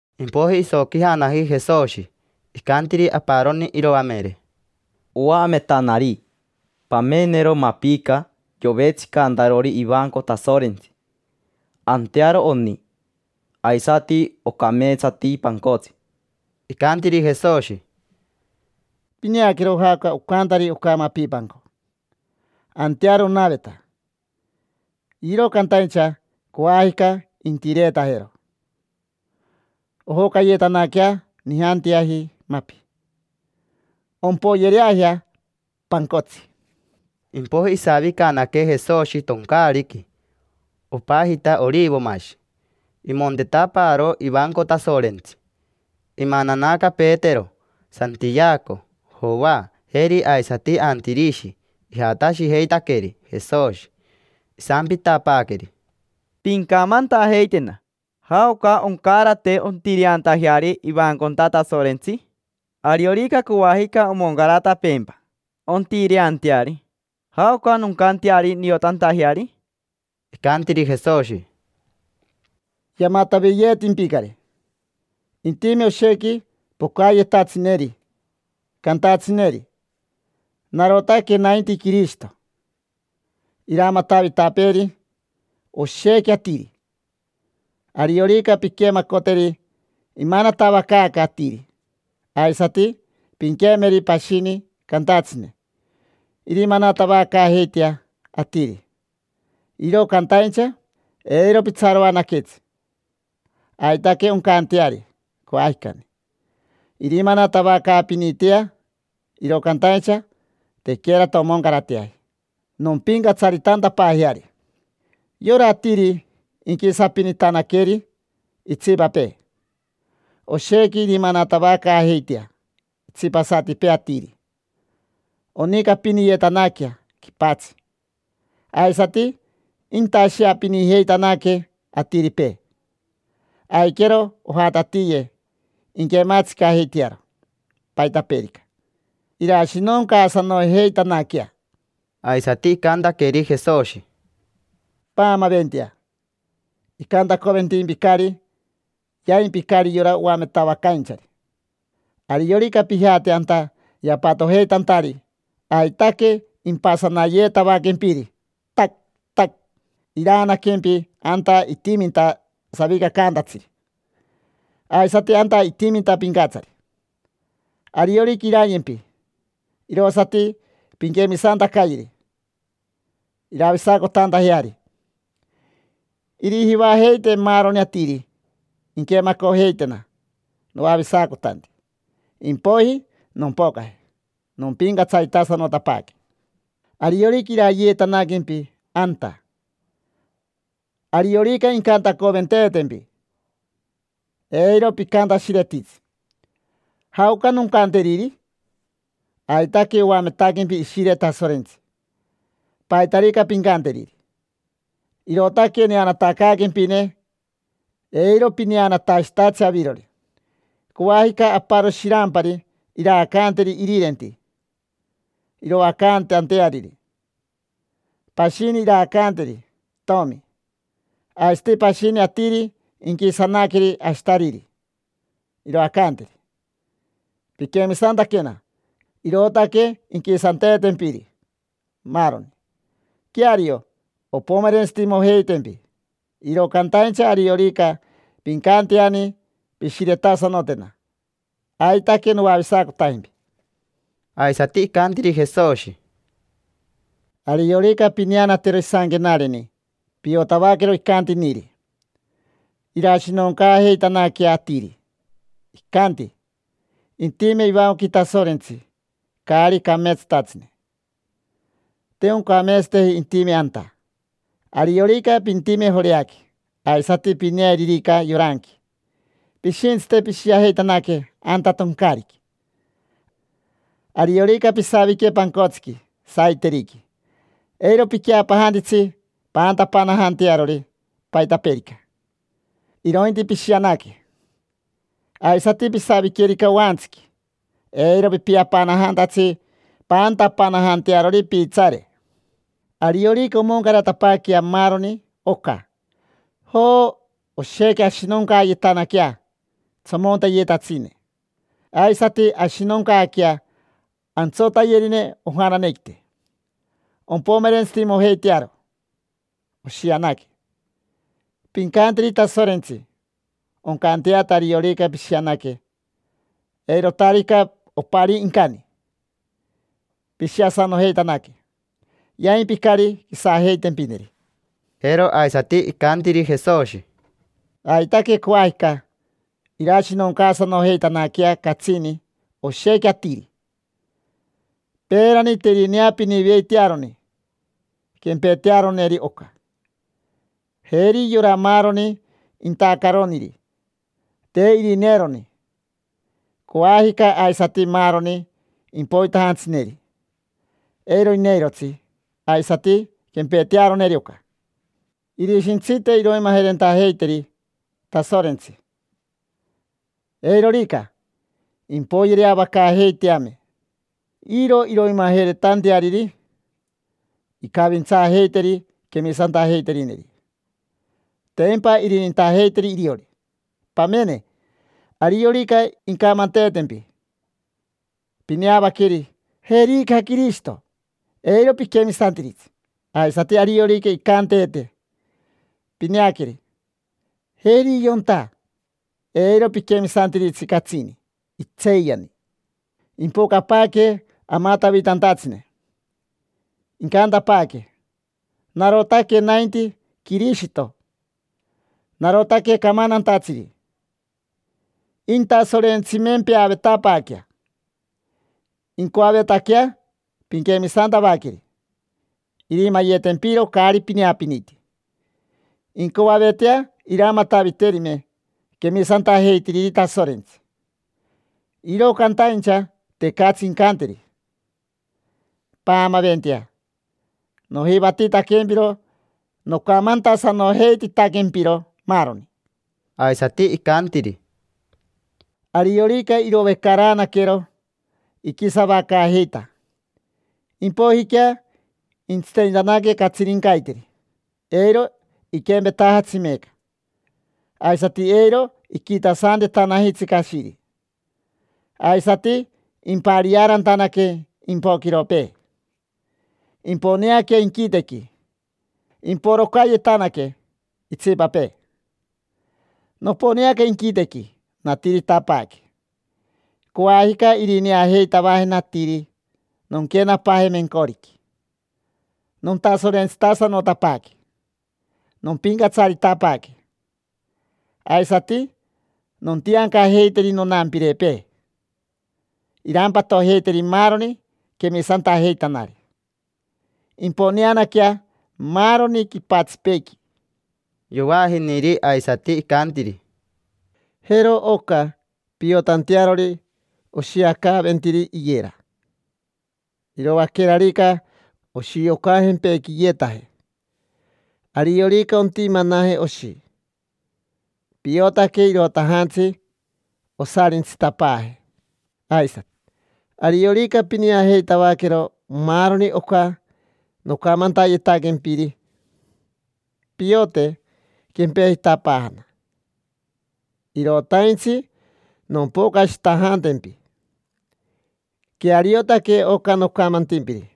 Impoiji isoquijanaji Jesoshi. Icantiri aparoni iroamere: —Oametanari. Pamenero mapica yovetsicantarori ivanco Tasorentsi: antearo oni, aisati ocameetsati pancotsi. Icantiri Jesoshi: —Pineaquero jaoca ocantari oca mapipanco. Antearo onaveta, iro cantaincha coajica intireetajero, ojocayetanaquea nijanteaji mapi. Ompoyereajea pancotsi. Impoiji isavicanaque Jesoshi toncaariqui, opajita Orivomashi. Imontetapaaro ivanco Tasorentsi. Imananaca Petero, Santiaco, Joa, jeri aisati Antirishi: ijatashijeitaqueri Jesoshi. Isampitapaaqueri: —Pincamantajeitena. ¿Jaoca oncarate ontireantajeari ivanconta Tasorentsi? Ariorica coajica omoncaratapeempa ontireanteari, ¿jaoca noncanteari niotantajeari? Icantiri Jesoshi: —Yamataviyeetimpicari. Intime oshequi pocayetatsineri, cantatsineri: “Narotaque nainti Quirishito”. Iramatavitapeeri oshequi atiri. Ariorica pinquemacoteri imanatavacaaca atiri, aisati pinquemeri pashini cantatsine: “Irimanatavacaajeitea atiri”. Iro cantaincha eiro pitsaroanaquetsi. Aitaque oncanteari coajicani, irimanatavacaapinitea, iro cantaincha tequerata omoncarateaji nompincatsaritantapaajeari. Yora atiri inquisapinitanaqueri itsipapee. Oshequi irimanatavacaajeitea itsipasatipee atiri. Onicapiniyetanaquea quipatsi, aisati intasheapinijeitanaque atiripee. Aiquero ojatatiye, inquematsicajeitearo paitapeerica, irashinoncaasanojeitanaquea. Aisati icantaqueri Jesoshi: —Paamaventea. Icantacoventimpicari, yaimpicari yora oametavacainchari. Ariorica pijate anta yapatojeitantari aitaque impasanayeetavaquempiri, tac, tac. Iraanaquempi anta itiminta savicacaantatsiri, aisati anta itiminta pincatsari. Ariorica irayempi, irosati pinquemisantacayeri, iravisacotantajeari. Irijivajeite maaroni atiri inquemacojeitena noavisacotanti, impoiji nompocaje, nompincatsaritasanotapaaque. Ariorica irayeetanaquempi anta, ariorica incantacoventeetempi, eiro picantashiretitsi: “¿Jaoca noncanteriri?” Aitaque oametaquempi Ishire Tasorentsi paitarica pincanteriri. Irootaque neanatacaaquempine, eiro pineanatashitatsi avirori. Coajica aparo shirampari iraacanteri irirenti, iroacantanteariri. Pashini iraacanteri itomi. Aisati pashini atiri inquisanaqueri ashitariri, iroacanteri. Piquemisantaquena, irootaque inquisanteetempiri maaroni. Queario, ompomerentsitimojeitempi, iro cantaincha ariorica pincanteani pishiretasanotena, aitaque noavisacotajempi. Aisati icantiri Jesoshi: —Ariorica pineanatero isanquenareni Iranirini, piotavaquero icantiniri: irashinoncaajeitanaquea atiri. Icanti intime ivancoqui Tasorentsi caari cameetsatatsine. Te oncameetsateji intime anta. Ariorica pintime Joreaqui, aisati pineeririca yoranqui, pishintsite pishiajeitanaque anta toncaariqui. Ariorica pisavique pancotsiqui saiteriqui, eiro piqueapanajantitsi paantapanajantearori paitapeerica, irointi pishianaque. Aisati pisaviquerica oantsiqui, eiro pipiapanajantatsi paantapanajantearori piitsaare. Ariorica omoncaratapaaquea maaroni oca, joo, oshequi ashinoncayetanaquea tsomonteyetatsine, aisati ashinoncaaquea antsotayerine ojananequite: ompomerentsitimojeitearo oshianaque. Pincanteri Tasorentsi, oncanteata ariorica pishianaque, eirotarica oparii incani. Pishiasanojeitanaque, yaimpicari quisajeitempineri. Jero aisati icantiri Jesoshi: —Aitaque coajica irashinoncaasanojeitanaquea catsini oshequi atiri. Peerani te irineapiniveitearoni quempetearoneri oca, jeri yora maaroni intacaroniri, te irineeroni. Coajica aisati maaroni impoitajantsineri, eiro ineirotsi aisati quempetearoneri oca. Irishintsite iroimajerentajeiteri Tasorentsi: eirorica, impoyereavacaajeiteame. Iro iroimajeretanteariri, incavintsaajeiteri quemisantajeiterineri, tempa irinintajeiteri iriori. Pamene, ariorica incamanteetempi: “Pineavaqueri: jerica Quirishito”, eiro piquemisantiritsi. Aisati ariorica incanteete: “Pineaqueri: jeri yonta”, eiro piquemisantiritsi catsini, itseeyani. Impocapaaque amatavitantatsine, incantapaaque: “Narotaque nainti Quirishito, narotaque camantantatsiri”. Intasorentsimempeavetapaaquea, incoavetaquea pinquemisantavaqueri, irimayetempiro caari pineapiniti. Incoavetea iramataviterime quemisantajeitiriri Tasorentsi, iro cantaincha tecatsi incanteri. Paamaventea. Nojivatitaquempiro nocamantasanojeititaquempiro maaroni. Aisati icantiri: —Ariorica irovecaraanaquero iquisavacaajeita, impoijiquea intsitenitanaque catsirincaiteri, eiro iquempetajatsi meeca. Aisati eiro iquitasantetanajitsi cashiri. Aisati impariaarantanaque impoquiropee, imponeaquea inquitequi, imporocayetanaque itsipapee. Noponeaca inquitequi, natiritapaaque: coajica irineajeitavajena atiri nonquenapaaje mencoriqui. Nontasorentsitasanotapaaque, nompincatsaritapaaque. Aisati nontiancajeiteri nonampirepee irampatojeiteri maaroni quemisantajeitanari. Imponeanaquea maaroni quipatsipeequi. Yovaajiniri aisati, icantiri: —Jero oca piotantearori oshiacaaventiri iyera. Iroaquerarica oshiocajempequiyetaje, ariorica ontimanaje oshi, piotaque irotajantsi osarintsitapaaje. Aisati, ariorica pineajeitavaquero maaroni oca nocamantayetaquempiri, piote quempejitapaajana, irotaintsi nompocashitajantempi. Queariotaque oca nocamantimpiri.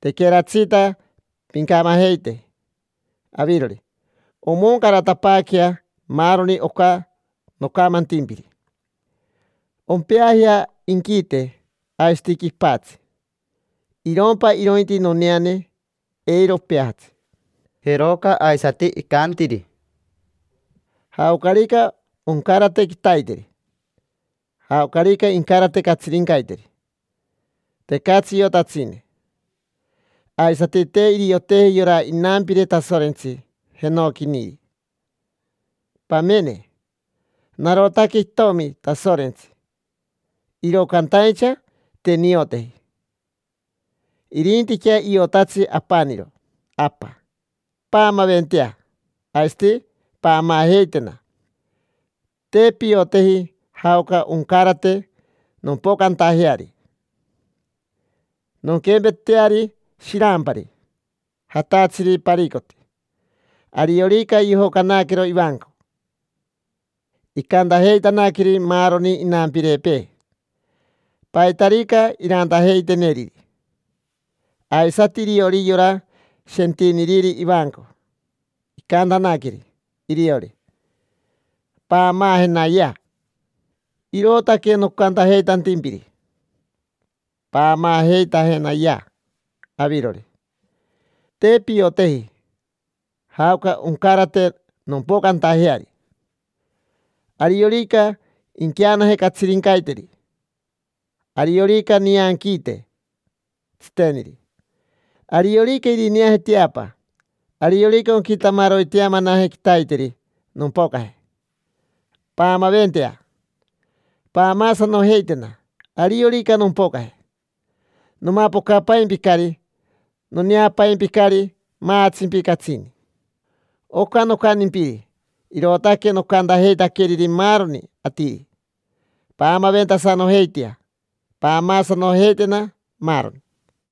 Tequeratsita pincamajeite avirori, omoncaratapaaquea maaroni oca nocamantimpiri. Ompeajea inquite aisati quipatsi, irompa irointi noneane, eiro opeajatsi. Jeroca aisati icantiri: —Jaocarica oncarate quitaiteri, jaocarica incarate catsirincaiteri, tecatsi iotatsine. Aisati te irioteji yora inampire Tasorentsi jenoquiniri. Pamene, narotaque itomi Tasorentsi, iro cantaincha te nioteji. Irintiquea iotatsi apaniro Apa. Paamaventea, aisati paamaajeitena. Te pioteji jaoca oncarate nompocantajeari. Nonquempeteari shirampari, jatatsiri paricoti. Ariorica yojocanaquero ivanco, icantajeitanaqueri maaroni inampirepee paitarica irantajeiteneriri. Aisati iriori yora shentiniriri ivanco icantanaqueri iriori: “Paamaajenayea”. Irootaque nocantajeitantimpiri: paamaajeitajenayea avirori. Te pioteji jaoca oncarate nompocantajeari: ariorica inqueanaje catsirincaiteri, ariorica nianquiite tsiteniri, ariorica irineaje teapa, ariorica onquitamaroiteamanaje quitaiteri nompocaje. Paamaventea, paamaasanojeitena. Ariorica nompocaje, nomapocapaimpicari. Noneapaimpicari, maatsimpi catsini. Oca nocantimpiri, irootaque nocantajeitaqueriri maaroni atiri. Paamaventasanojeitea, paamaasanojeitena, maaroni.